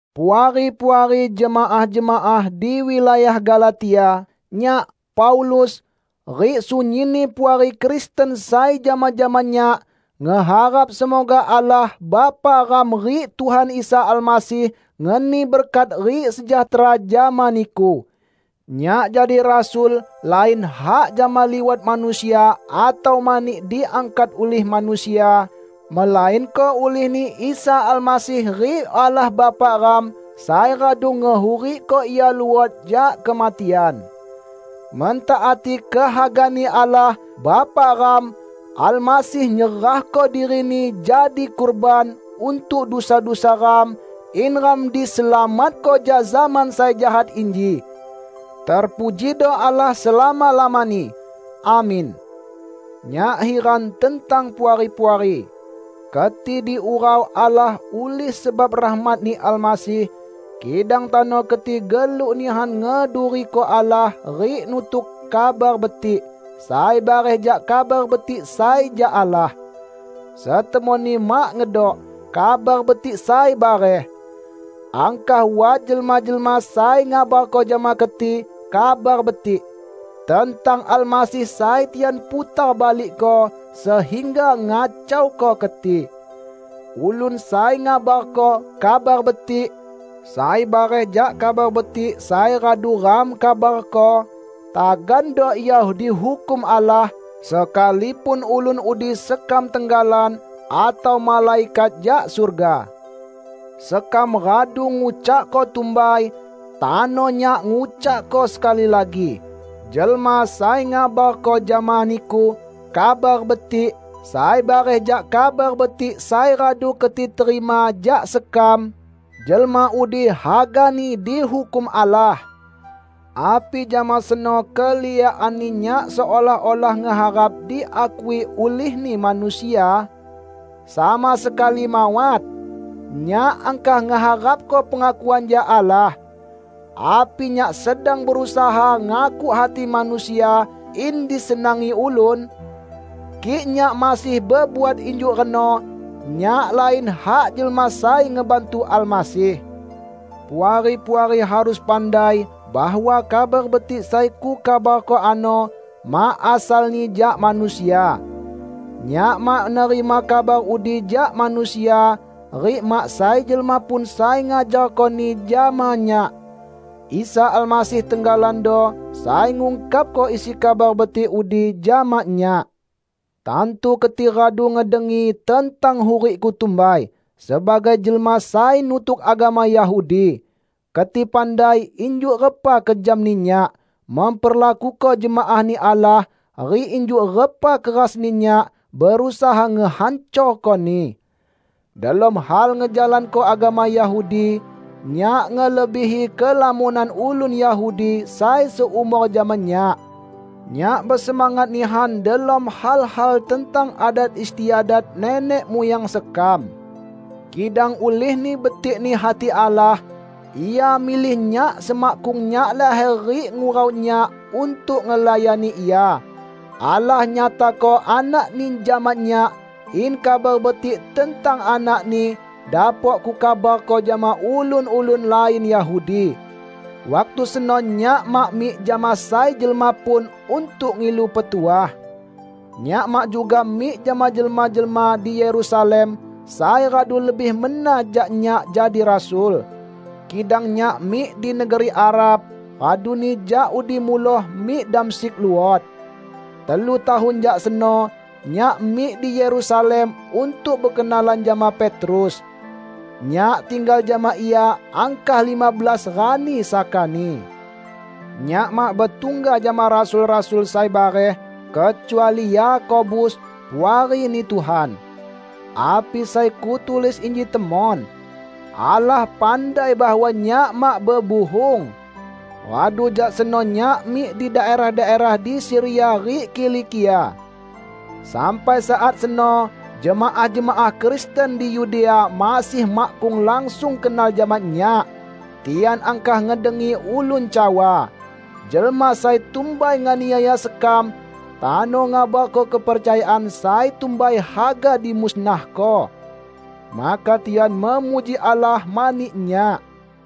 Puari-puari jemaah-jemaah di wilayah Galatia, Nyak, Paulus, rik sunyinni puari Kristen sai jama-jama nyak, ngeharap semoga Allah Bapa ram rik Tuhan Isa Almasih ngeni berkat rik sejahtera jama niku. Nyak jadi rasul lain hak jama liwat manusia atau mani diangkat ulih manusia, melainko ulih-Ni Isa Almasih rik Allah Bapa ram sai radu ngehurikko Ia luot jak kematian. Mentaati kehaga-Ni Allah Bapa ram, Almasih nyerahko diri-Ni jadi kurban untuk dusa-dusa ram, in ram diselamatko jak zaman sai jahat inji. Terpujido Allah selama-lamani! Amin. Nyak hiran tentang Puari-puari! Keti diurau Allah ulih sebab rahmat-Ni Almasih, kidang tano keti geluk nihan ngeduriko Allah rik nutuk "kabar betik" sai bareh jak Kabar Betik sai jak Allah. Setemonni mak ngedok "kabar betik sai bareh". Angkah wat jelma-jelma sai ngabarko jama keti "kabar betik" tentang Almasih sai tian putar balikko sehingga ngacauko keti. Ulun sai ngabarko "kabar betik" sai bareh jak Kabar Betik sai radu ram kabarko, tagando ia dihukum Allah -- sekalipun ulun udi sekam tenggalan atau malaikat jak surga! Sekam radu ngucakko tumbai, tano nyak ngucakko sekali lagi: Jelma sai ngabarko jama niku "kabar betik" sai bareh jak Kabar Betik sai radu keti terima jak sekam, jelma udi hagani dihukum Allah! Api jama seno keliakanni nyak seolah-olah ngeharap diakui ulihni manusia? Sama sekali mawat! Nyak angkah ngeharapko pengakuan jak Allah. Api nyak sedang berusaha ngakuk hati manusia in disenangi ulun? Kik nyak masih bebuat injuk reno, nyak lain hak jelma sai ngebantu Almasih. Puari-puari harus pandai bahwa Kabar Betik sai kukabarko ano mak asalni jak manusia. Nyak mak nerima kabar udi jak manusia, rik mak sai jelma pun sai ngajarkoni jama nyak. Isa Almasih tenggalando sai ngungkapko isi Kabar Betik udi jama nyak. Tantu keti radu ngedengi tentang hurikku tumbai sebagai jelma sai nutuk agama Yahudi. Keti pandai injuk repa kejamni nyak memperlakuko jemaah-Ni Allah rik injuk repa kerasni nyak berusaha ngehancorkoni. Delom hal ngejalanko agama Yahudi, nyak ngelebihi kelamonan ulun Yahudi sai seumor jama nyak. Nyak besemangat nihan delom hal-hal tentang adat istiadat nenek muyang sekam. Kidang ulihni betik-Ni hati Allah, Ia milih nyak semakkung nyak laher rik ngurau nyak untuk ngelayani Ia. Allah nyatako Anak-Ni jama nyak in Kabar Betik tentang Anak-Ni dapok kukabarko jama ulun-ulun lain Yahudi. Waktu seno nyak mak mik jama sai jelma pun untuk ngilu petuah. Nyak mak juga mik jama jelma-jelma di Yerusalem sai radu lebih mena jak nyak jadi rasul. Kidang nyak mik di negeri Arab, raduni jak udi muloh mik Damsyik luot. Telu tahun jak seno, nyak mik di Yerusalem untuk bekenalan jama Petrus. Nyak tinggal jama ia angkah lima belas rani sakani. Nyak mak betungga jama rasul-rasul sai bareh, kecuali Yakobus, puari-Ni Tuhan. Api sai kutulis inji temon. Allah pandai bahwa nyak mak bebuhung! Radu jak seno nyak mik di daerah-daerah di Siria rik Kilikia. Sampai saat seno jemaah-jemaah Kristen di Yudea masih makkung langsung kenal jama nyak. Tian angkah ngedengi ulun cawa, "Jelma sai tumbai nganiaya sekam, tano ngabarko kepercayaan sai tumbai haga dimusnahko." Maka tian memuji Allah mani nyak.